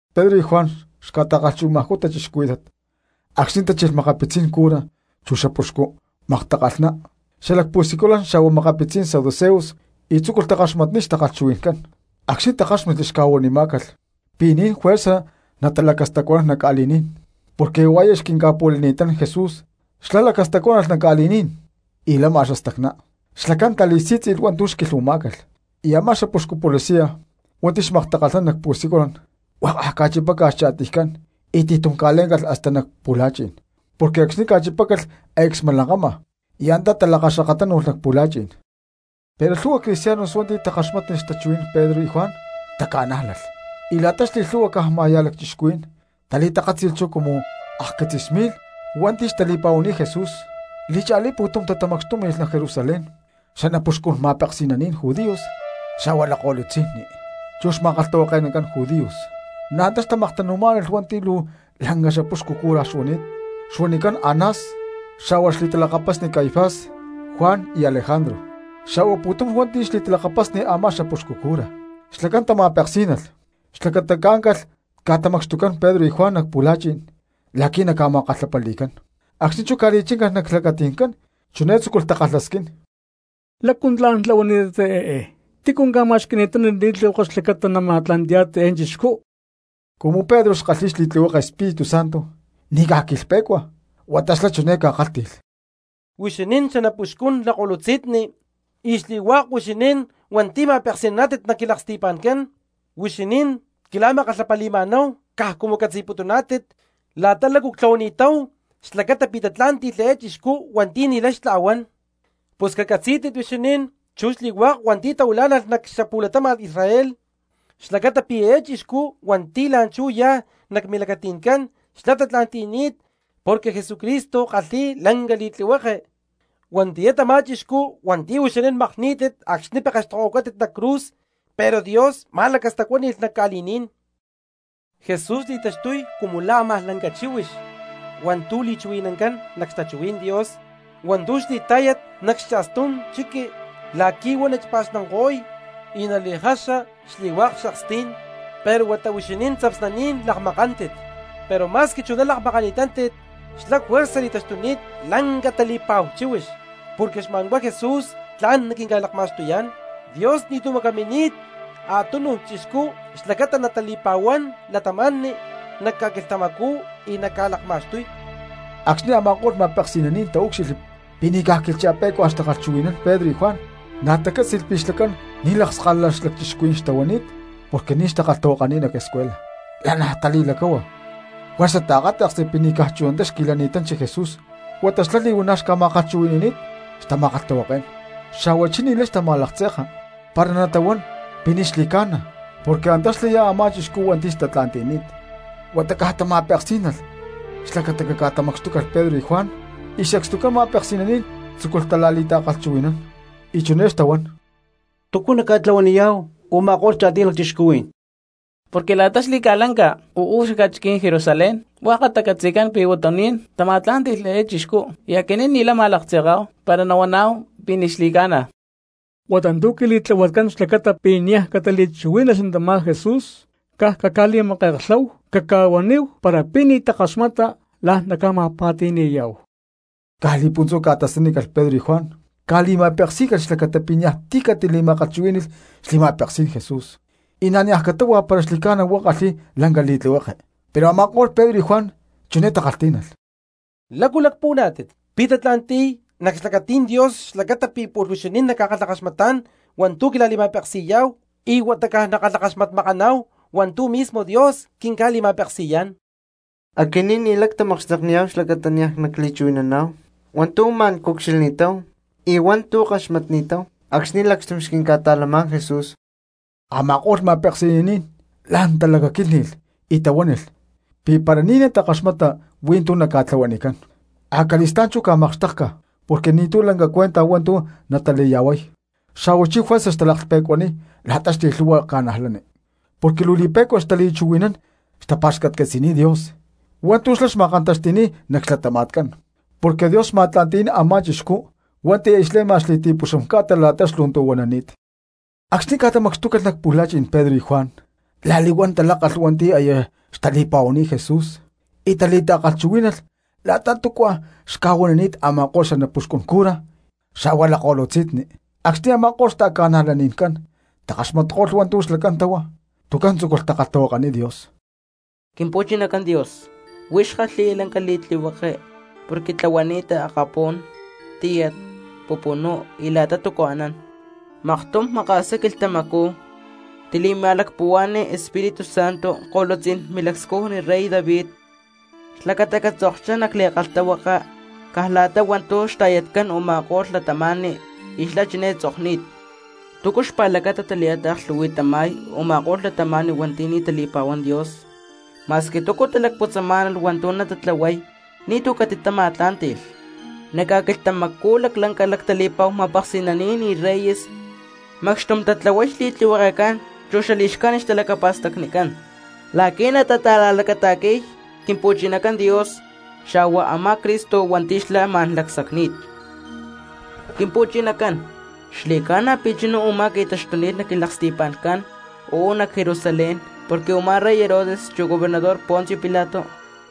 Pedro xa̠hua Juan xca̠ta̠kalhchuhui̠namajcú cristianos acxni̠ tachilh makapitzí̠n cura chu xapuxcu maktakalhná xalac pu̠siculan xa̠hua makapitzí̠n saduceos y tzúculh takaxmatniy xtakalhchuhui̠ncán. Acxni̠ takáxmatli xca̠huanimá̠calh pi̠ ni̠n juerza natalacastacuanán nac ca̠li̠ní̠n porque huá aya xquinca̠pu̠lanini̠tán Jesús xlá lacastacuánalh nac ca̠li̠ní̠n y lama xastacná, xlacán tali̠sí̠tzi̠lh hua̠ntu̠ xquilhuamá̠calh. Y a̠má xapuxcu policia hua̠nti̠ xmaktakalhnán nac pu̠siculan huakaj ca̠chipácalh xcha̠tiycán y ti̠tum ca̠lé̠ncalh hasta nac pu̠la̠chi̠n, porque acxni̠ ca̠chipácalh aya xca̠smalankama, y antá talakaxkakatánu̠lh nac pu̠la̠chi̠n. Pero lhu̠hua cristianos hua̠nti̠ takaxmátnilh xtachuhui̠ncán Pedro y Juan taca̠nájlalh, y la̠ta xli̠lhu̠hua caj ma̠ya̠ lacchixcuhuí̠n tali̠takátzi̠lh chú cumu akquitzis mi̠lh hua̠nti̠ xtali̠pa̠huani̠t Jesús. Li̠cha̠lí pu̠tum tatamacxtúmi̠lh nac Jerusalén xanapuxcun ma̠peksi̠naní̠n judíos xa̠hua lakko̠lutzi̠nni, chu xma̠kalhtahuake̠nacán judíos. Na̠ antá xtamaktanu̠má̠nalh hua̠nti̠ luu lanca xapuxcu cura xuani̠t xuanicán Anás, xa̠hua xli̠talakapasni Caifás, Juan y Alejandro, xa̠hua pu̠tum hua̠nti̠ xli̠talakapasni a̠má xapuxcu cura. Xlacán tama̠peksí̠nalh xlacata caáncalh ca̠tamacxtucán Pedro y Juan nac pu̠la̠chi̠n la̠qui̠ naca̠ma̠kalhapali̠cán; acxni̠ chú ca̠li̠chíncalh nac xlacati̠ncán chiné tzúculh takalhasquín: —¿Lácu tla̠n tlahuani̠tátit eé? ¿Tícu ca̠ma̠xqui̠ni̠tán li̠tlihueke xlacata nama̠tla̠nti̠yá̠tit eé chixcú? Cumu Pedro xkalhi̠y xli̠tlihueke Espíritu Santo ni̠ caj quilhpe̠cua huata xlá chiné ca̠kálhti̠lh: —Huixinín xanapuxcun lakko̠lutzi̠nni y xli̠hua̠k huixinín hua̠nti̠ ma̠peksi̠naná̠tit nac quilaksti̠pa̠ncán: huixinín quila̠ma̠kalhapali̠ma̠náhu caj cumu catzi̠putuná̠tit la̠ta lácu ctlahuani̠táhu xlacata pi̠ tatlá̠nti̠lh eé chixcú hua̠nti̠ ni̠lay xtla̠huán. Pus cacatzí̠tit huixinín chu xli̠hua̠k cristianos hua̠nti̠ tahuilá̠nalh nac xapu̠latama̠n Israel xlacata pi̠ eé chixcú hua̠nti̠ la̠nchú yá nac milacati̠ncán xlá tatla̠nti̠ni̠t porque Jesucristo kalhi̠y lanca li̠tlihueke, huatiyá tamá chixcú hua̠nti̠ huixinín makní̠tit acxni̠ pekextokohuacátit nac cruz, pero Dios ma̠lacastacuáni̠lh nac ca̠li̠ní̠n. Jesús li̠taxtuy cumu la̠ a̠má lanca chíhuix hua̠ntu̠ li̠chuhui̠nancán nac xtachuhuí̠n Dios hua̠ntu̠ xli̠tá̠yat nac xcha̠stú̠n chiqui la̠qui̠ huá nachipa̠xnanko̠y y nali̠jaxa xli̠hua̠k xakstí̠n, pero huata huixinín tzapsnaní̠n lakmakántit. Pero ma̠squi chuná lakmakántit xlá juerza li̠taxtuni̠t lanca tali̠pa̠hu chíhuix. Porque xma̠nhuá Jesús tla̠n quinca̠lakma̠xtuyá̠n, Dios ni̠tu̠ macamini̠t a̠túnuj chixcú xlacata natali̠pa̠huán cristianos nac ca̠quilhtamacú y naca̠lakma̠xtuy. Acxni̠ a̠ma̠ko̠lh ma̠peksi̠naní̠n taúcxilhli pi̠ ni̠caj quilhcha̠pé̠cuaj xtachuhui̠nán Pedro y Juan, na̠ tacátzi̠lh pi̠ xlacán ni̠ lakskalala lacchixcuhuí̠n xtahuanít porque ni̠ xtakalhtahuakani̠t nac escuela, lanaj tali̠lacáhua juerza taakáta̠ksli pi̠ ni̠caj chunatá xqui̠lani̠tanchi Jesús huata xlá li̠huana̠ xca̠ma̠kalhchuhui̠ni̠ni̠t xtama̠kalhtahuaké̠n. Xa̠huachí ni̠lay xtama̠laktze̠ka para natahuán pi̠ ni̠ xli̠ca̠na porque antá xlaya a̠má chixcú hua̠nti̠ xtatla̠nti̠ni̠t. Huata caj tama̠peksí̠nalh xlacata caca̠tamacxtúcalh Pedro y Juan y sacstucán ma̠peksi̠naní̠n tzúculh tala̠li̠ta̠kalhchuhui̠nán. Y chiné xtahuán: —¿Túcu naca̠tlahuaniyá̠hu u̠ma̠ko̠lh cha̠tiy lacchixcuhuí̠n? Porque la̠ta xli̠ca̠lanca uú cxaca̠chiquí̠n Jerusalén huakatá catzi̠cán pi̠ huatuní̠n tama̠tlá̠nti̠lh eé chixcú y aquinín ni̠lay nama̠laktze̠ká̠hu para nahuaná̠hu pi̠ ni̠ xli̠ca̠na. Huata tu̠ quili̠tlahuatcán xlacata pi̠ niaj catali̠chuhuí̠nalh tamá Jesús, caj caca̠li̠make̠klháhu caca̠huaníhu para pi̠ ni̠ takaxmata la̠n naca̠ma̠pa̠ti̠ni̠yá̠hu. Caj li̠puntzú ca̠tasanícalh Pedro y Juan, ca̠li̠ma̠peksí̠calh xlacata pi̠ niaj ti̠ catali̠ma̠kalhchuhuí̠ni̠lh xli̠ma̠peksí̠n Jesús, y na̠ niaj catáhua para xli̠ca̠na huá kalhi̠y lanca li̠tlihueke. Pero a̠ma̠ko̠lh Pedro y Juan chiné takalhtí̠nalh: —¿Lácu lacpuhuaná̠tit? ¿Pi̠ tatla̠nti̠y nac xlacatí̠n Dios xlacata pi̠ pu̠lh huixinín nacca̠kalhakaxmatá̠n hua̠ntu̠ naquila̠li̠ma̠peksi̠yá̠hu y huata caj nackalhakaxmatmakaná̠hu hua̠ntu̠ mismo Dios quinca̠li̠ma̠peksi̠yá̠n? Aquinín ni̠lay ctamakxtekniyá̠hu xlacata niaj nacli̠chuhui̠naná̠hu hua̠ntu̠ ma̠n cucxilhni̠táhu y hua̠ntu̠ ckaxmatnini̠táhu acxni̠ lacxtum xquinca̠ta̠lamá̠n Jesús. Ama̠ko̠lh ma̠peksi̠naní̠n la̠n talacaquílhni̠lh y tahuánilh pi̠ para ni̠ takaxmata hui̠ntú naca̠tlahuanicán, acali̠stá̠n chú ca̠makxtékcalh porque ni̠tu̠ lanca cuenta hua̠ntu̠ natali̠ya̠huay, xa̠huachí juerza xtalaklhpe̠cuaniy la̠ta xli̠lhu̠hua cristianos porque luu li̠pe̠cua xtali̠chuhui̠nán y xtapa̠xcatcatzi̠niy Dios hua̠ntu̠ xlá xma̠kantaxti̠ni̠t nac xlatama̠tcán; porque Dios xma̠tla̠nti̠ni̠t a̠má chixcú hua̠nti̠ aya xle̠ma xli̠ti̠puxam ca̠ta la̠ta xlu̠ntu̠huanani̠t. Acxni̠ ca̠tamacxtúcalh nac pu̠la̠chi̠n Pedro y Juan la̠li̠huán talákalh hua̠nti̠ aya xtali̠pa̠huani̠t Jesús y tali̠ta̠kalhchuhuí̠nalh la̠ta túcua xca̠huanini̠t a̠ma̠ko̠lh xanapuxcun cura xa̠hua lakko̠lutzi̠nni. Acxni̠ a̠ma̠ko̠lh xta̠ca̠najlani̠ncán takaxmatko̠lh hua̠ntu̠ xlacán táhua, tuncán tzúculh takalhtahuakaniy Dios: —Quimpu̠chinacán Dios, huix kalhi̠ya lanca li̠tlihueke porque tlahuani̠ta akapú̠n, tíyat, pupunú y la̠ta túcu anán. Maktum maka̠sá quilhtamacú tili̠ma̠lacpuhua̠ni Espíritu Santo ko̠lutzí̠n milacscujni rey David xlacata catzokchá nac li̠kalhtahuaka caj la̠ta hua̠ntu̠ xta̠yatcán u̠ma̠ko̠lh cristianos y xlá chiné tzokni̠t: ¿Túcu xpa̠lacata tali̠taaklhu̠hui̠tama̠y tama̠ko̠lh cristianos hua̠nti̠ ni̠ tali̠pa̠huán Dios? Ma̠squi túcu talacputzamá̠nalh hua̠ntu̠ natatlahuay ni̠tu̠ catitama̠tlá̠nti̠lh. Nac ca̠quilhtamacú laclanca lactali̠pa̠hu ma̠peksi̠naní̠n y reyes macxtum tatláhualh xli̠tlihuekecán chu xali̠xcájnit xtalacapa̠stacnicán, la̠qui̠ natata̠la̠lacata̠qui̠y Quimpu̠chinacán Dios xa̠hua a̠má Cristo hua̠nti̠ xlá ma̠n lacsacni̠t. ’Quimpu̠chinacán, xli̠ca̠na pi̠ chuná u̠má qui̠taxtuni̠t nac quilaksti̠pa̠ncán uú nac Jerusalén, porque a̠má rey Herodes, chu gobernador Poncio Pilato,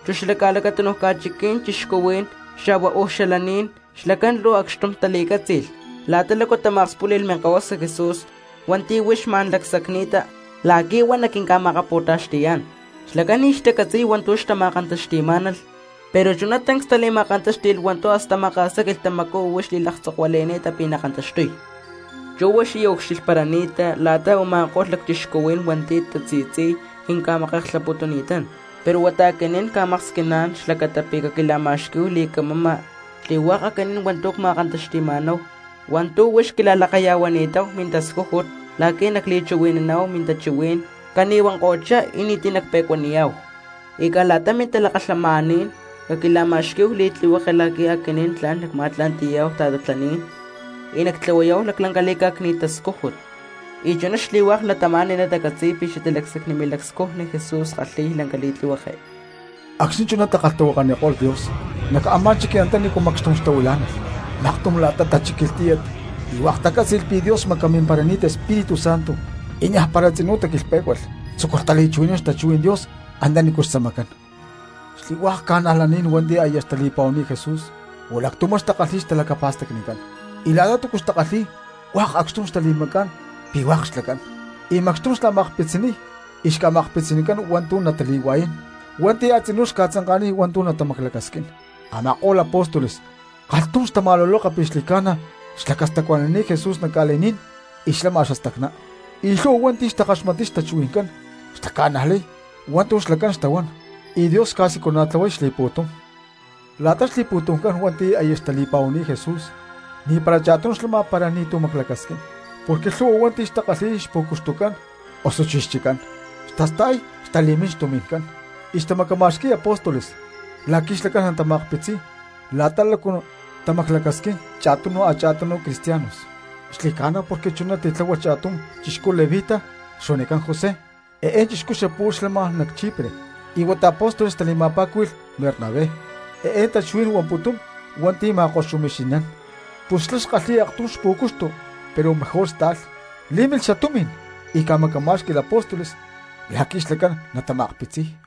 chu xala a̠lacatúnuj ca̠chiqui̠ní̠n cristianos, xa̠hua uú xalaní̠n, xlacán luu acxtum tali̠cátzi̠lh la̠ta lácu tama̠akspúli̠lh Minkahuasa Jesús hua̠nti̠ huix ma̠n xlacsacni̠ta la̠qui̠ huá naquinca̠ma̠akapu̠taxti̠yá̠n. Xlacán ni̠ xtacatzi̠y hua̠ntu̠ xtama̠kantaxti̠má̠nalh, pero chuná tancs tali̠ma̠kantáxti̠lh hua̠ntu̠ hasta xamaka̠sá quilhtamacú huix xlaclhca̠huili̠ni̠ta pi̠ nakantaxtuy. Chú huix aya ucxilhparani̠ta la̠ta tama̠ko̠lh lacchixcuhuí̠n hua̠nti̠ tasi̠tzi̠y quinca̠make̠klhaputuni̠tán, pero huata aquinín cca̠maksquiná̠n xlacata pi̠ caquila̠ma̠xquí̠hu li̠camama xli̠hua̠k aquinín hua̠nti̠ ma̠kantaxti̠ma̠náhu hua̠ntu̠ huix quila̠lakaya̠huani̠táhu mintascújut la̠qui̠ tla̠n nacli̠chuhui̠naná̠hu mintachuhuí̠n cani̠huanko̠chá y ni̠ti̠ nacpe̠cuaniyá̠hu. Y caj la̠ta mintalakalhamaní̠n caquila̠ma̠xquí̠hu mili̠tlihueke la̠qui̠ aquinín tla̠n nacma̠tla̠nti̠yá̠hu ta̠tatlaní̠n y nactlahuayá̠hu laclanca li̠cá̠cni̠t tascújut, y chuná xli̠hua̠k cristianos natacatzi̠y pi̠ xatalacsacni milacscujni Jesús kalhi̠y lanca li̠tlihueke. Acxni̠ chuná takalhtahuakaniko̠lh Dios, nac a̠má chiqui antanícu macxtum xtahuilá̠nalh maktum la̠ta tachíquilh tíyat y hua̠k tacátzi̠lh pi̠ Dios xmacamimparani̠t Espíritu Santo y niajpara tzinú taquilhpé̠cualh tzúculh tali̠chuhui̠nán xtachuhuí̠n Dios antanícu xtzamacán. Xli̠hua̠k cristianos hua̠nti̠ aya xtali̠pa̠huani̠t Jesús pu̠lactumá xtakalhi̠y xtalacapa̠stacnicán, y la̠ta túcu xtakalhi̠y hua̠k acxtum tali̠macá̠n hua̠k xlacán, y macxtum xla̠ma̠akpitziniy y xca̠ma̠xqui̠cán hua̠ntu̠ natali̠hua̠yán hua̠nti̠ a̠tzinú xca̠tzanka̠niy hua̠ntu̠ natamaclacasquín. Ama̠ko̠lh apóstoles kalhtum xtama̠luloka pi̠ xli̠ca̠na xlacastacuanani̠t Jesús nac ca̠li̠ní̠n y xlama xastacná, y lhu̠hua hua̠nti̠ xtakaxmatniy xtachuhui̠ncán xtaca̠najlay hua̠ntu̠ xlacán xtahuán, y Dios xca̠siculana̠tlahuay xli̠pu̠tum. La̠ta xli̠pu̠tumcán hua̠nti̠ aya xtali̠pa̠huani̠t Jesús ni̠para cha̠tum xlama para ni̠tu̠ maclacasquín, porque lhu̠hua hua̠nti̠ xtakalhi̠y xpu̠cuxtucán osuchí xchiccán, xtasta̠y, xtali̠mín xtumi̠ncán, y xtamacama̠xqui̠y apóstoles la̠qui̠ xlacán natama̠akpitziniy la̠ta lácu tamaclacasquimá̠nalh cha̠tunu cha̠tunu cristianos. Xli̠ca̠na, porque chuná titláhualh cha̠tum chixcú levita xuanicán José; eé chixcú xapu̠lh xlama nac Chipre, y huata apóstoles tali̠ma̠pa̠cúhui̠lh Bernabé, eé tachuhuí̠n huamputún: Hua̠nti̠ ma̠koxumixi̠nán. Pus xlá xkalhi̠y aktum pú̠cuxtu pero mejor sta̠lh, lí̠milh xatumi̠n y ca̠macamá̠xqui̠lh apóstoles la̠qui̠ xlacán natama̠akpitziy.